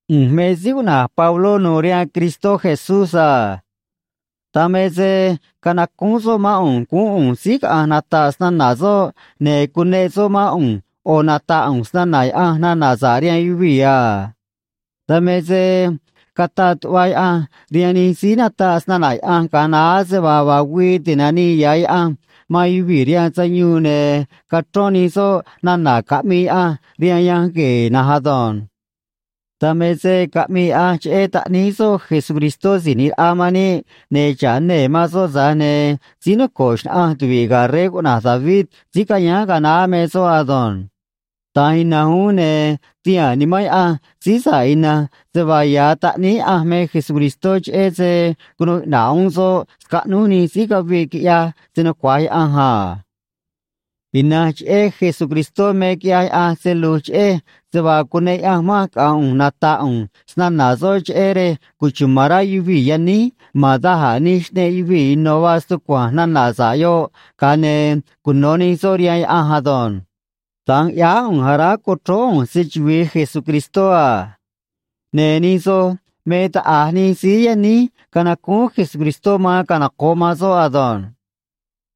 ꞌU̱nj me síí cuꞌna̱j Pabló nu̱u̱ rihaan Cristó Jesús a. Dan me se canacúún soꞌ mán ꞌu̱nj guún ꞌu̱nj síí caꞌa̱nj nata̱ꞌ snana̱ soꞌ, ne̱ cuneꞌ soꞌ mán ꞌu̱nj ꞌo̱ nata̱ꞌ ꞌu̱nj snana̱ Yaꞌanj nana̱ sa̱ꞌ rihaan yuvii̱ a. Dan me se cataꞌ tuꞌva Yaꞌanj rihaan nij síí nataꞌ snana̱ Yaꞌanj ga̱a naá se vaa vaa güii ti̱nanii ya̱ Yaꞌanj man yuvii̱ rihaan sayuun, ne̱ cachrón nij soꞌ nana̱ caꞌmii Yaꞌanj rihaan Yanj Gue̱e̱ na̱nj ado̱nj. Dan me se caꞌmii Yaꞌanj cheꞌé Taꞌníí soꞌ Jesucristó Si̱j ꞌNi̱j Raꞌa man níꞌ, ne̱ xa̱ꞌ nee̱ ma̱n soꞌ, tza̱j ne̱ síí noco̱ꞌ xnaꞌanj tuvi̱ꞌ ga̱ rey cuꞌna̱j David síí cayáán ga̱a naá me soꞌ ado̱nj. Da̱nj ina̱nj uún ne̱ tihaa̱n Nimán Yaꞌanj síí sa̱ꞌ ina̱nj se vaa ya̱ Taꞌníí Yaꞌanj me Jesucristó cheꞌé se cunuu iꞌna̱ꞌ uún soꞌ scaꞌnúj nij síí caviꞌ quiꞌyaj se‑nucua̱j Yaꞌanj a. Ina̱nj cheꞌé Jesucristó me quiꞌyaj Yaꞌanj se lu̱j cheꞌej se vaa cuneꞌ Yaꞌanj manj caꞌa̱nj ꞌu̱nj nata̱ꞌ ꞌu̱nj snana̱ soꞌ cheꞌé rej cuchuma̱n rá yuvii̱ yaníj ma̱n da̱j a̱ nij xꞌneꞌ yuvii̱ ino̱ vaa stucua̱nj nana̱ sa̱ꞌ yoꞌ, ga̱a ne̱ cuno̱ nij soꞌ rihaan Yaꞌanj ado̱nj. Da̱nj ꞌyáá ꞌu̱nj aráj co̱chróó ꞌu̱nj se‑chuvi̱i Jesucristó a. Ne̱ nij soj me taꞌa̱j nij síí yaníj canacúún Jesucristó man canoco̱ꞌ man soꞌ ado̱nj.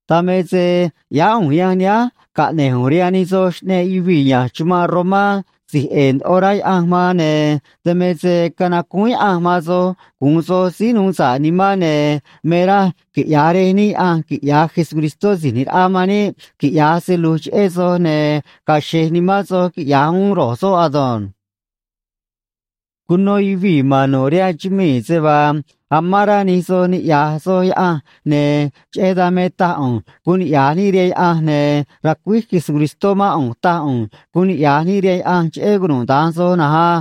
Dan me se ꞌyáá ꞌu̱nj yanj nihánj caꞌne̱j ꞌu̱nj rihaan nij soj xꞌneꞌ yuvii̱ ya̱nj chumanꞌ Romá si̱j ꞌe̱e̱ ndoꞌo rá Yaꞌanj man, ne̱ dan me se canacúún Yaꞌanj man soj gu̱un soj síí nuu sa̱ꞌ nimán, ne̱ me raj quiꞌya̱j Rej níꞌ Yaꞌanj quiꞌya̱j Jesucristó Si̱j ꞌNi̱j Raꞌa man níꞌ quiꞌya̱j se lu̱j cheꞌé soj, ne̱ ga̱a̱ xe̱j nimán soj, quiꞌya̱j uún ro̱j soꞌ ado̱nj. Cuno yuvii̱ ma̱n nu̱ꞌ rihaan chumii̱ se vaa amán rá nij soj niꞌya̱j soj Yaꞌanj, ne̱ cheꞌé dan me taj ꞌu̱nj guun niꞌya̱j níꞌ rihaan Yaꞌanj, ne̱ racuíj Jesucristó mán ꞌu̱nj taj ꞌu̱nj guun niꞌya̱j níꞌ rihaan Yaꞌanj cheꞌé cunuda̱nj soj na̱nj á.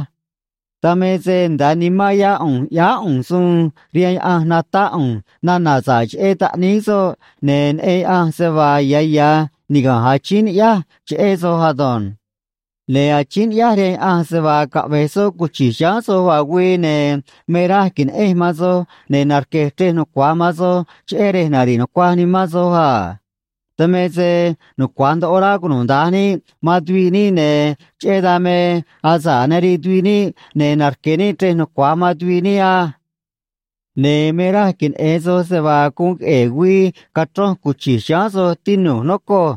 Dan me se nda̱a nimán yá ꞌu̱nj ꞌyáá ꞌu̱nj suun rihaan Yaꞌanj natáꞌ ꞌu̱nj nana̱ sa̱ꞌ cheꞌé Taꞌníí soꞌ, ne̱ neꞌen Yaꞌanj se vaa ya̱ ya̱ niga̱nj achíín ni̱ꞌyáj cheꞌé soj ado̱nj. Ne̱ achíín ni̱ꞌyáj rihaan Yaꞌanj se vaa caꞌve̱j soꞌ cuchi̱j chiháán soj vaa güii, ne̱ me raj que̱neꞌenj man soj ne̱ narque̱j chrej nucua̱j man soj, cheꞌé rej nari̱ꞌ nucuaj nimán soj a. Dan me se nucua̱j ndoꞌo rá cunuda̱nj níꞌ man tuviꞌ níꞌ, ne̱ cheꞌé dan me asa̱ꞌ nariꞌ tuviꞌ níꞌ, ne̱ narque̱ níꞌ chrej nucua̱j man tuviꞌ níꞌ á. Ne̱ me raj queneꞌe̱n soj se vaa guun queꞌe̱e̱ güii cachronj cuchi̱j chiháán soj, tinu̱j, nocoj.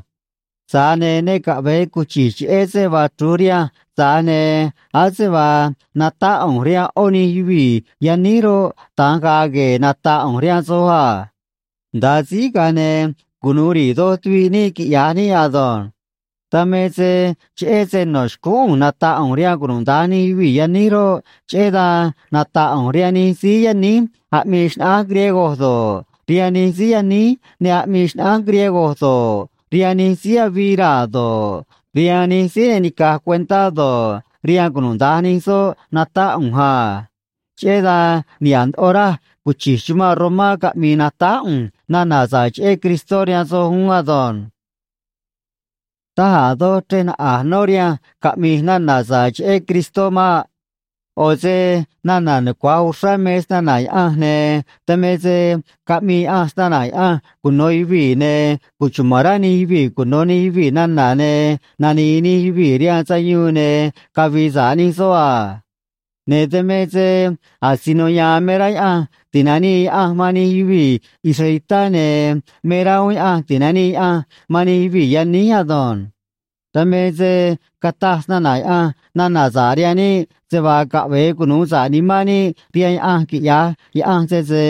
Tza̱j ne̱ ne caꞌve̱e cuchi̱j, cheꞌé se vaa chru̱j rihanj, tza̱j ne̱ ase vaa natáꞌ ꞌu̱nj rihaan ꞌó nij yuvii̱ yaníj roꞌ, da̱nj ga̱a̱ gue̱e̱ nata̱ꞌ ꞌu̱nj rihaan soj a. Nda̱a síj, ga̱a ne̱ cunu̱u ri̱i̱ doj tuviꞌ níꞌ, quiꞌya̱j níꞌ ado̱nj. Dan me se cheꞌé se no̱ xcúún ꞌu̱nj nata̱ꞌ ꞌu̱nj rihaan cunuda̱nj nij yuvii̱ yaníj roꞌ, cheꞌé dan nata̱ꞌ ꞌu̱nj rihaan nij síí yaníj aꞌmii xnaꞌánj griego do̱ꞌ, rihaan nij síí yaníj ne aꞌmii xnaꞌánj griego do̱ꞌ, rihaan nij síí avii raa̱ do̱ꞌ, rihaan nij síí ne nica̱j cuentá do̱ꞌ, rihaan cunuda̱nj nij soꞌ natáꞌ ꞌu̱nj a. Cheꞌé dan niha̱ꞌ ndoꞌo raj cuchi̱j chumanꞌ Romá caꞌmi̱i̱ natáj ꞌu̱nj nana̱ sa̱ꞌ cheꞌé Cristó rihaan soj uún ado̱nj. Taj a̱ doj chrej naꞌa̱j nó rihanj caꞌmi̱j nana̱ sa̱ꞌ cheꞌé Cristó maꞌ. ꞌO̱ se nana̱ nucua̱j uxrá me snana̱ Yaꞌanj, ne̱ dan me se caꞌmii Yaꞌanj snana̱ Yaꞌanj cuno̱ yuvii̱, ne̱ cuchuma̱n rá nij yuvii̱ cuno̱ nij yuvii̱ nana̱, ne̱ nani̱i̱ nij yuvii̱ rihaan sayuun ne̱ cavi̱i̱ sa̱ꞌ nij soꞌ a. Ne̱ dan me se asino ya̱a̱n me rá Yaꞌanj ti̱nanii Yaꞌanj man nij yuvii̱ israelitá, ne̱ me rá uún Yaꞌanj ti̱nanii Yaꞌanj man nij yuvii̱ yaníj ado̱nj. Dan me se cataj snana̱ Yaꞌanj nana̱ sa̱ꞌ rihaan níꞌ se vaa caꞌve̱e cunu̱u sa̱ꞌ nimán níꞌ rihaan Yaꞌanj, quiꞌya̱j Yaꞌanj, sese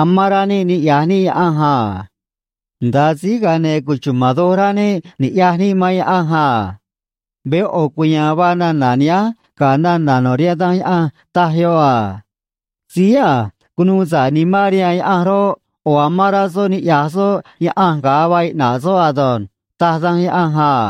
amán rá níꞌ niꞌya̱j níꞌ Yaꞌanj a. Nda̱a síj, ga̱a ne̱ cuchuma̱n doj rá níꞌ ni̱ꞌyaj níꞌ man Yaꞌanj a. Veé ꞌo̱ cuya̱a̱n vaa nana̱ nihánj ga̱ nana̱ no̱ rihaan Danj Yaꞌanj, taj yoꞌ a: “Síí a̱j cunuu sa̱ꞌ nimán rihaan Yaꞌanj roꞌ, ꞌo̱ amán rá soꞌ niꞌya̱j soꞌ Yaꞌanj ga̱a vaa iꞌna̱ꞌ soꞌ ado̱nj”, taj Danj Yaꞌanj a.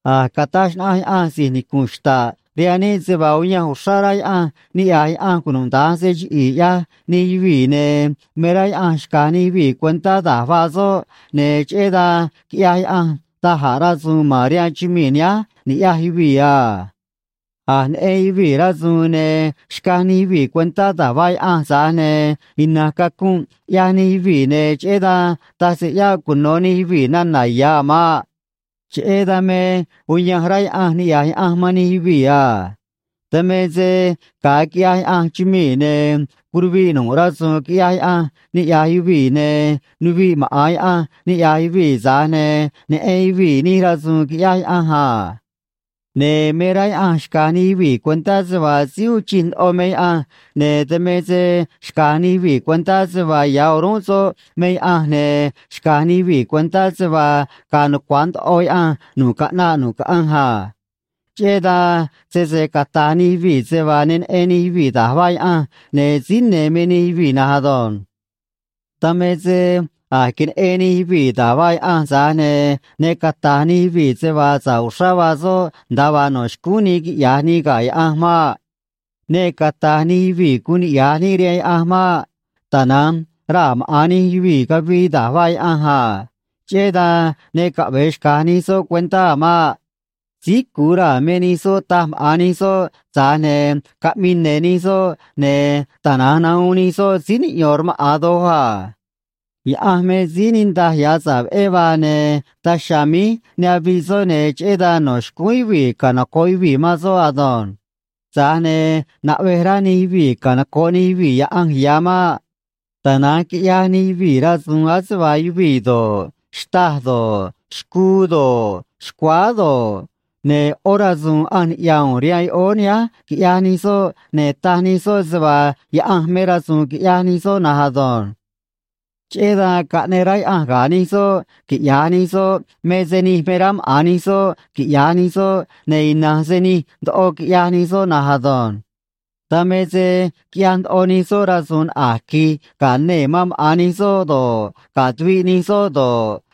A̱j cataj xnaꞌanj Yaꞌanj si̱j nicu̱nꞌ xta̱ꞌ rihaan níꞌ se vaa uyanj uxrá rá Yaꞌanj niꞌya̱j Yaꞌanj cunuda̱nj se chiꞌi̱i̱ ꞌyaj nij yuvii̱, ne̱ me rá Yaꞌanj xca̱j nij yuvii̱ cuentá da̱j vaa soꞌ, ne̱ cheꞌé dan quiꞌyaj Yaꞌanj da̱j a̱ rasu̱u̱n ma̱n rihaan chumii̱ nihánj ni̱ꞌyaj yuvii̱ a. A̱j neꞌen yuvii̱ rasu̱u̱n, ne̱ xcaj nij yuvii̱ cuentá da̱j vaa Yaꞌanj, tza̱j ne̱ ina̱nj cacunꞌ ꞌyaj nij yuvii̱, ne̱ cheꞌé dan taj se ꞌyáꞌ cuno̱ nij yuvii̱ nana̱ ya̱ a̱ maꞌ. Cheꞌé dan me uyanj rá Yaꞌanj niꞌya̱j Yaꞌanj man nij yuvii̱ a. Dan me se ga̱a quiꞌyaj Yaꞌanj chumii̱, ne̱ curuviꞌ nu̱ꞌ rasu̱u̱n quiꞌyaj Yaꞌanj niꞌya̱j yuvii̱, ne̱ nuviꞌ maꞌa̱n Yaꞌanj niꞌya̱j yuvii̱, tza̱j ne̱ neꞌen yuvii̱ nij rasu̱u̱n quiꞌyaj Yaꞌanj a. Ne̱ me rá Yaꞌanj xca̱j nij yuvii̱ cuentá se vaa síí uun chij ndoꞌo me Yaꞌanj, ne̱ dan me se xca̱j nij yuvii̱ cuentá se vaa ya̱ o̱rúnꞌ soꞌ me Yaꞌanj, ne̱ xca̱j nij yuvii̱ cuentá se vaa ga̱a̱ nucua̱j ndoꞌo Yaꞌanj nu̱ꞌ caꞌnaꞌ nu̱ꞌ caꞌanj a. Cheꞌé dan sese cata̱j nij yuvii̱ se vaa ne neꞌen nij yuvii̱ da̱j vaa Yaꞌanj, ne̱ síí ne̱ me nij yuvii̱ na̱nj ado̱nj. Dan me se a̱j queneꞌen nij yuvii̱ da̱j vaa Yaꞌanj, tza̱j ne̱ ne cata̱j nij yuvii̱ se vaa sa̱ꞌ uxrá vaa soꞌ nda̱a vaa no̱ xcúún nii quiꞌya̱j nii ga̱ Yaꞌanj maꞌ. Ne cata̱j nij yuvii̱ guun niꞌya̱j níꞌ rihaan Yaꞌanj maꞌ. Tana̱nj raa̱ maꞌa̱n nij yuvii̱ cavii da̱j vaa Yaꞌanj a. Cheꞌé dan ne caꞌve̱e xca̱j nij soꞌ cuentá a̱ maꞌ. Síí cu̱u raa̱ me nij soꞌ, taj maꞌa̱n nij soꞌ, tza̱j ne̱ caꞌmii ne̱ nij soꞌ, ne̱ tana̱nj nahuun nij soꞌ síí niꞌyo̱n rmaꞌa̱n doj a. Yaꞌanj me síí niꞌndaj ya̱ sa̱ꞌ veꞌé vaa, ne̱ daj chiha̱a̱ míj ne aviꞌ soꞌ, ne̱ cheꞌé dan no̱ xcúún yuvii̱ canoco̱ꞌ yuvii̱ man soꞌ ado̱nj. Tza̱j ne̱ naꞌvej rá nij yuvii̱ canoco̱ꞌ nij yuvii̱ Yaꞌanj ya̱ maꞌ. Tana̱nj quiꞌyaj nij yuvii̱ rasu̱u̱n ase vaa yuvii̱ do̱ꞌ, xtâj do̱ꞌ, xcuu do̱ꞌ, xcuáá do̱ꞌ, ne̱ ꞌó rasu̱u̱n ꞌanj niꞌya̱ u̱u̱n rihaan yoꞌóó nihánj quiꞌyaj nij soꞌ, ne̱ taj nij soꞌ se vaa yaꞌanj me rasu̱u̱n quiꞌyaj nij soꞌ na̱nj ado̱nj. Cheꞌé dan caꞌneꞌ rá Yaꞌanj ga̱ nij soꞌ quiꞌya̱j nij soꞌ me se nij me rá maꞌa̱n nij soꞌ quiꞌya̱j nij soꞌ, ne̱ ina̱nj se nij ndoꞌo quiꞌyaj nij soꞌ na̱nj ado̱nj. Dan me se quiꞌyaj ndoꞌo nij soꞌ rasu̱u̱n naꞌa̱j qui̱j ga̱ nee̱ man maꞌa̱n nij soꞌ do̱ꞌ, ga̱ tuviꞌ nij soꞌ do̱ꞌ,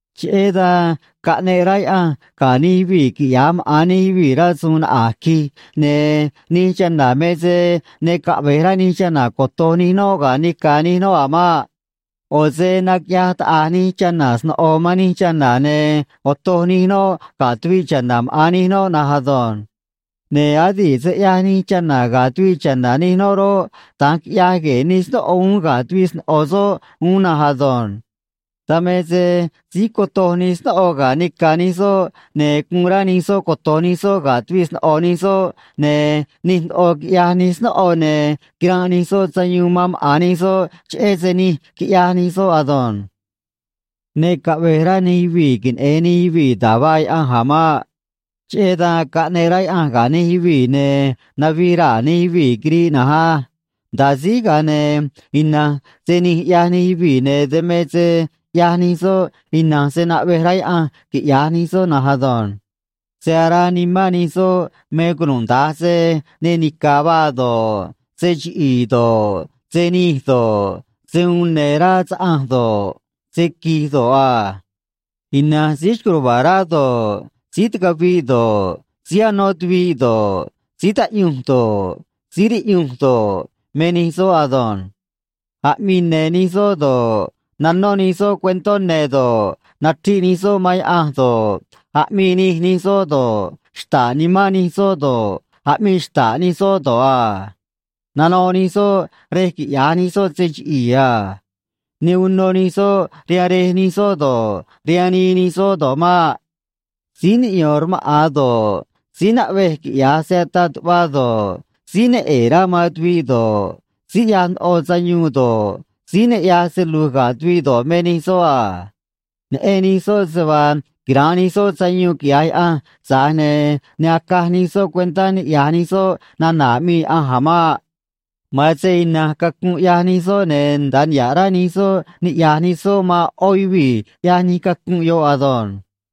Cheꞌé dan caꞌneꞌ rá Yaꞌanj ga̱ nij yuvii̱ quiꞌya̱j maꞌa̱n nij yuvii̱ rasu̱u̱n naꞌa̱j qui̱j, ne̱ nij chana̱ me se ne caꞌve̱j rá nij chana̱ coto̱j nij noꞌ ga̱ nica̱ nij noꞌ a̱ maꞌ. ꞌO̱ se naquiꞌyaj taꞌa̱j nij chana̱ sno̱ꞌo man nij chana̱, ne̱ otoj nij noꞌ ga̱ tuviꞌ cha̱na̱ maꞌa̱n nij noꞌ na̱nj ado̱nj. Ne̱ adi̱ꞌ se ꞌyaj nij chana̱ ga̱ tuviꞌ cha̱na̱ nij noꞌ roꞌ, da̱nj quiꞌyaj gue̱e̱ nij snóꞌo uún ga̱ tuviꞌ sno̱ꞌo soꞌ uún na̱nj ado̱nj. Dan me se síj cotoj nij snóꞌo ga̱ nica̱ nij soꞌ, ne̱ guun rá nij soꞌ coto̱j nij soꞌ ga̱ tuviꞌ sno̱ꞌo nij soꞌ, ne̱ nij ndoꞌo quiꞌyaj nij snóꞌo, ne̱ quiranꞌ nij soꞌ sayuun man maꞌa̱n nij soꞌ cheꞌé se nij quiꞌyaj nij soꞌ ado̱nj. Ne caꞌve̱j rá nij yuvii̱ queneꞌe̱n nij yuvii̱ da̱j vaa Yaꞌanj a̱ maꞌ. Cheꞌé dan caꞌneꞌ rá Yaꞌanj ga̱ nij yuvii̱, ne̱ navij raa̱ nij yuvii̱ quiriꞌ na̱nj á. Nda̱a síj, ga̱a ne̱ ina̱nj se nij ꞌyaj nij yuvii̱, ne̱ dan me se ꞌyaj nij soꞌ ina̱nj se naꞌvej rá Yaꞌanj quiꞌya̱j nij soꞌ na̱nj ado̱nj. Se araa nimán nij soꞌ me cunuda̱nj se ne nica̱ vaa do̱ꞌ, se chiꞌi̱i̱ do̱ꞌ, se nij do̱ꞌ, se uun ne̱ rá saꞌanj do̱ꞌ, se qui̱j do̱ꞌ a. Ina̱nj síí xco̱j ruva̱a̱ rá do̱ꞌ, síí ticaviꞌ do̱ꞌ, síí anó tuviꞌ do̱ꞌ, síí taꞌyunj do̱ꞌ, síí riꞌyunj do̱ꞌ, me nij soꞌ ado̱nj. Aꞌmii ne̱ nij soꞌ do̱ꞌ, nanó nij soꞌ cuentó ne̱ do̱ꞌ, nachriꞌ nij soꞌ man Yaꞌanj do̱ꞌ, aꞌmii nij nij soꞌ do̱ꞌ, xta̱ꞌ nimán nij soꞌ do̱ꞌ, aꞌmii xta̱ꞌ nij soꞌ do̱ꞌ a. Nanoꞌ nij soꞌ rej quiꞌya̱j nij soꞌ se chiꞌi̱i̱ a. Ne uno nij soꞌ rihaan rej nij soꞌ do̱ꞌ, rihaan nii nij soꞌ do̱ꞌ maꞌ. Síí niꞌyón rmaꞌa̱n do̱ꞌ, síí naꞌvej quiꞌya̱j se ataꞌ tuꞌva do̱ꞌ, síí ne ꞌe̱e̱ rá man tuviꞌ do̱ꞌ, síí ꞌyaj ndoꞌo sayuun do̱ꞌ, síí ne ꞌyaj se lu̱j ga̱ tuviꞌ do̱ꞌ, me nij soꞌ a. Neꞌen nij soꞌ se vaa quira̱nꞌ nij soꞌ sayuun, quiꞌya̱j Yaꞌanj, tza̱j ne̱ ne acaj nij soꞌ cuentá niꞌya̱j nij soꞌ nana̱ aꞌmii Yaꞌanj a̱ maꞌ. Ma̱an se ina̱nj cacunꞌ ꞌyaj nij soꞌ, ne̱ nda̱a niha̱ꞌ rá nij soꞌ niꞌya̱j nij soꞌ man ꞌó yuvii̱ ꞌyaj nij cacunꞌ yoꞌ ado̱nj.